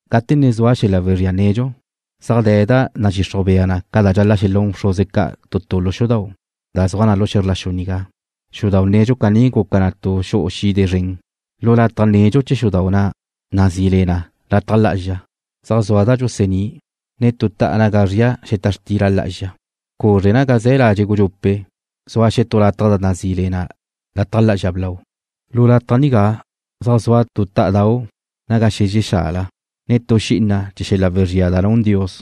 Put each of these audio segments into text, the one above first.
Gate ne zua xel-la' wezría nedxu, zaj de̱ da nadxixruj bea ca dxal-la' xelún bxruze ca' tu lu xudau' da zua xe̱zr la xu nigá. Xudau' nedxu caní guca na tu xu'u xide zren. Lu lataj nedxu chee̱ xudau' na' da nazí le na Lataj Lá'azxa zaj zua da dxusa'ní', ne tu ta'a naga zria xeta xtila lá'azxa. Cuzre naga ze̱ ladxe' gudxupe' zua xetú lataj da nazí le na Lataj Lá'azxa Blau. Lu lataj nigá zaj zua tu tá'adau' naga xezxe xala, ne tu xi'ina chee̱ xel-la' wezría da nun Dios,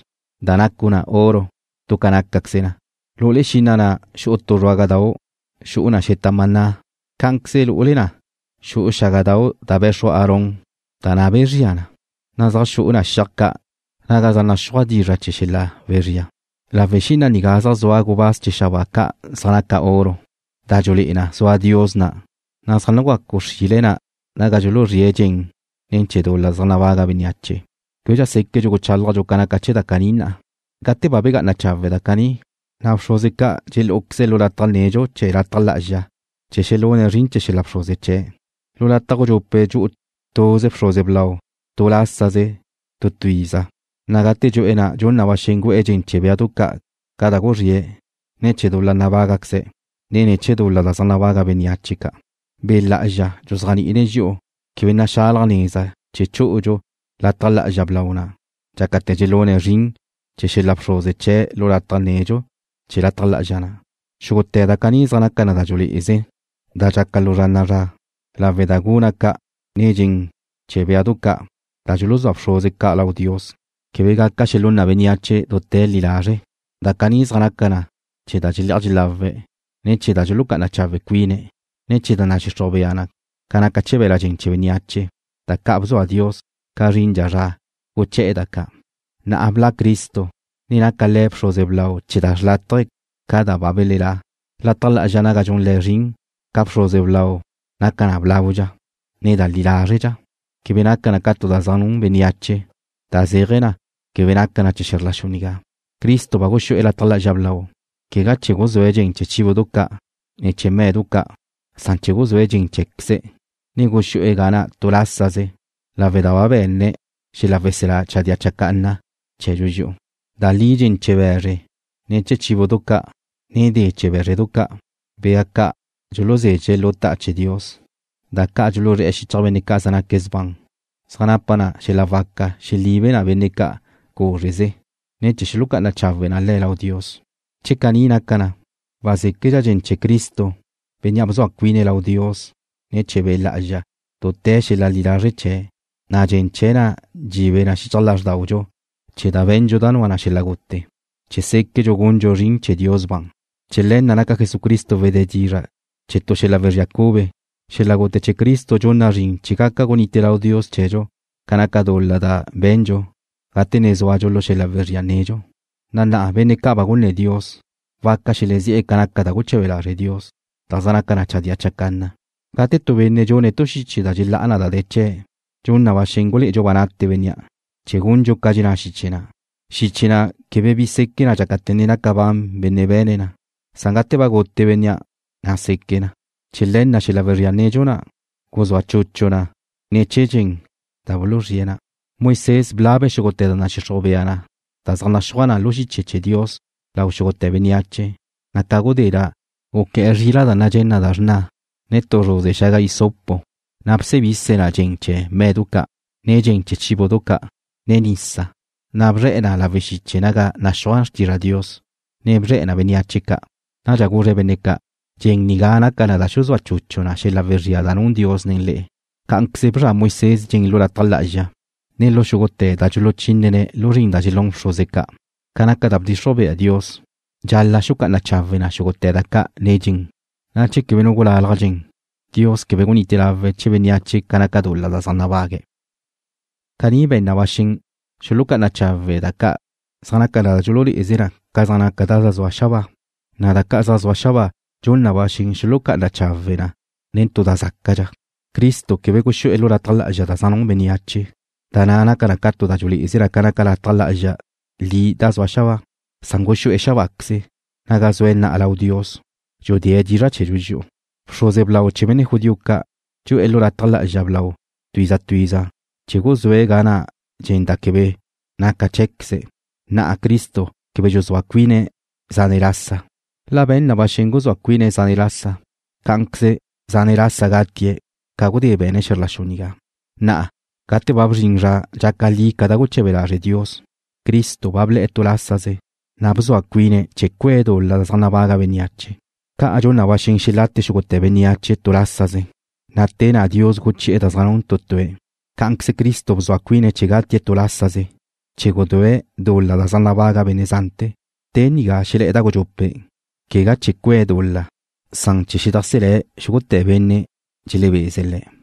da nacu na oro du ca nácaqueze na. Lu'ule xi'ina na' xu'u tu zruágadau' xu'u na xeta maná. Cá'anqueze lu'ule na xu'u xágadau' da be̱xru Aarón da na' bezría na, ne zaj xu'u na xiaj ca' naga zaj naxúaj dizra' chee̱ xel-la' wezría. Lawe' xi'ina nigá zaj zua gubáz chee̱ xabáa ca' zaj naca na oro, da dxululé'e na zua Dios na', na' zaj nugacu xrile na naga dxuluzríe̱' dxen ne̱ chee̱ dul-la zaj nabaga bénneache. Québedxa séquentu' guchálajntu' ca naca chee̱ da caní na'a. Gate ba nagá'ana chawe' da caní, na' bxruze ca' dxelú'uqueze̱' lu lataj nedxu chee̱ lataj lá'azxa chee̱ xelune̱' zrin chee̱ xel-la' bxruze chee̱'. Lu lataj gudxupe' dxu'u tuze bxruze blau tu lásaze tu tu iza, na' gate dxu'e̱ na' dxun na ba xen gu'e̱ dxen chee̱ béadu ca' da guzríe̱' ne̱ chee̱ dul-la nabágaqueze̱', ne ne̱ chee̱ dul-la zaj nabaga bénneache ca'. Be' Lá'azxa dxuzéajni'ine̱' dxi'u quebe naxalaj neza chee̱ chú'udxu Lataj Lá'azxa Blau na' dxácate̱ dxelune̱' zrin chee̱ xel-la' bxruze chee̱' lu lataj nedxu chee̱ lataj lá'azxa na'. Xúgute̱ da caní zaj naca na da dxululé'eze, da dxaca lu zra na'a zra, lawe' da guna' ca', ne dxen chee̱ béadu ca' da dxuluzúa bxruze ca' lau Dios quebe gaca xelún na bénneache dute̱ li lazre'. Da caní zaj naca na chee̱ da dxelé'aj dxelawe̱', ne chee̱ da dxulucá'ana chawe' cuine̱', ne chee̱ da nadxixruj bea ca naca chee̱ be̱la' dxen chee̱ bénneache, da ca' bzua Dios ca zrindxa zra guché̱'e̱ da ca'. Na'a ba bla' Cristo, ne naca Le̱' bxruze blau chee̱ da xrlátaje ca' da ba belelá'. Lataj Lá'azxa naga dxun Le̱' zrin ca bxruze blau naca na blaudxa, ne da li lázredxa. Quebe naca na tu da zaj nun bénneache, da zéaje̱ na, quebe naca na chee̱ xe̱zr la xu nigá. Cristo ba guxú'e̱ Lataj Lá'azxa Blau, quegá chee̱ guzúe̱' dxen chee̱ béadu ca', ne chee̱ me̱du ca', san chee̱ guzúe̱' dxen cheé̱queze̱', na' guxú'e̱ ga na' tu lásaze lawe' da ba be̱ne̱' xel-la' weselá chadía chacanna chee̱dxu dxi'u. Da li dxen chee̱ be̱zre, ne chee̱ béadu ca', ne de chee̱ bé̱zredu ca', bea ca' dxuluzezxe̱' lu ta'a chee̱ Dios, da ca' dxuluzré̱'e̱ xichaj benne' ca' zaj naque̱' sban, zaj napa na xel-la' waca xelibe na benne' ca' cúzreze, ne chee̱ xulucá'ana chawe na le̱' lau Dios. Che caní naca na, wazéquedxa dxen chee̱ Cristo, Bénnea' bzua cuine̱' lau Dios ne̱ chee̱ Be' Lá'azxa dute̱ xel-la' li lazre' chee̱', na' dxen chee̱' na' dxibe na xichaj lázrdaudxu chee̱ da be̱ndxu da nua na xel-la' gute, chee̱ séquedxu gundxu zrin chee̱ Dios ban. Chee̱ le̱ na' naca Jesucristo wedé dizra' chee̱ tu xel-la' wezría cube. Xel-la' gute chee̱ Cristo dxun na zrin chee̱ gaca gunite lau Dios chee̱dxu ca naca dul-la da be̱ndxu gate ne zúadxu lu xel-la' wezría nedxu, na' na'a benne' ca' ba gunné̱ Dios waca xelezí'e̱ ca naca da ca' guche̱be lazre' Dios, da zaj naca na chadía chacanna. Gate tu benne' dxune̱' tu xiche da dxelá'a na da de̱ chee̱', dxun na ba xen gulé'edxu ba nate bénnea' chee̱ gundxu ca dxenná xiche na'. Xiche na' quebe bi seque na dxácate̱ ne naca ban benne' be̱ne̱' na, san gate ba gute bénnea', na' seque na. Chee̱ le̱ na', xel-la' wezría nedxu na' guzúa chuchu na ne̱ chee̱ dxen da buluzríe̱' na. Moisés blabe̱' xúgute̱ da nadxixruj bea da zaj naxúaj na lu dizra' chee̱ Dios lau xúgute̱ bénneache, na' ca gudé na' guqué̱'e̱ zrila' da nadxé na da xrna, ne tu zruze xaga hisopo, na' gusebise̱' na dxen chee̱ me̱du ca', ne dxen chee̱ béadu ca', ne nisa, na' bzre̱'e̱ na lawe' xiche naga naxúaj xtizra Dios, ne bzre̱'e̱ na bénneache ca'. Nadxa guzre̱' benne' ca': “Dxen nigá naca na da dxuzúa chuchu na xel-la' wezría da nun Dios nen le'e.” Cá'anqueze bzra Moisés dxen lu lataj lá'azxa, ne lu xúgute̱ da dxuluchínene̱' lu zrin da dxelún bxruze ca'. Ca naca da bdxixruj bea Dios, dxal-la' xulucá'ana chawe̱' xúgute̱ da ca' nen dxen, na' che quebe nu gulalaj dxen, Dios quebe gunite lawe̱' chee̱ bénneache ca naca dul-la da zaj nabague̱'. Caní be̱n na ba xen xulucá'ana chawe̱' da ca' zaj naca na da dxululé'eze na ca zaj naca da zaj zua xabáa, na' da ca' zaj zua xabáa dxun na ba xen xulucá'ana chawe̱' na nen tu da zácadxa. Cristo quebe guxú'e̱ lu lataj lá'azxa da zaj nun bénneache, da na' naca na tu da dxulé'eze ca naca lataj lá'azxa li da zua xabáa, san guxú'e̱ xabáqueze, naga zue̱' na'a lau Dios, dxudée̱' dizra' chee̱dxu dxi'u. Bxruze blau chee̱ benne' judío ca' dxu'e̱ lu lataj lá'azxa blau tu iza tu iza chee̱ guzúe̱' ga na' dxen da quebe naca cheé̱queze̱'. Na'a Cristo quebe dxuzúa cuine̱' zane' lasa. La be̱n na ba xen guzúa cuine̱' zane' lasa, cá'anqueze zane' lasa gatie̱' ca gudé be̱ne̱' xe̱zr la xu nigá. Na'a, gate ba bzrin zra dxaca li ca da guche̱be lazre' Dios, Cristo ba ble̱'e̱ tu lásaze, na' bzua cuine̱' chee̱ cue̱' dul-la zaj nabaga bénneache. Ca dxun na ba xen xelate xúgute̱ bénneache tu lásaze, na' te na' Dios guchi'e̱ da zaj nun tu tue̱', cá'anqueze Cristo bzua cuine̱' chee̱ gutie̱' tu lásaze chee̱ gudúe̱' dul-la zaj nabaga' benne' zante̱. Te nigá xelé̱'e̱ da gudxupe', quegádxa chee̱ cue̱' dul-la, san chee̱ xedajselé̱' xúgute̱ benne' dxelebeze̱' Le̱'.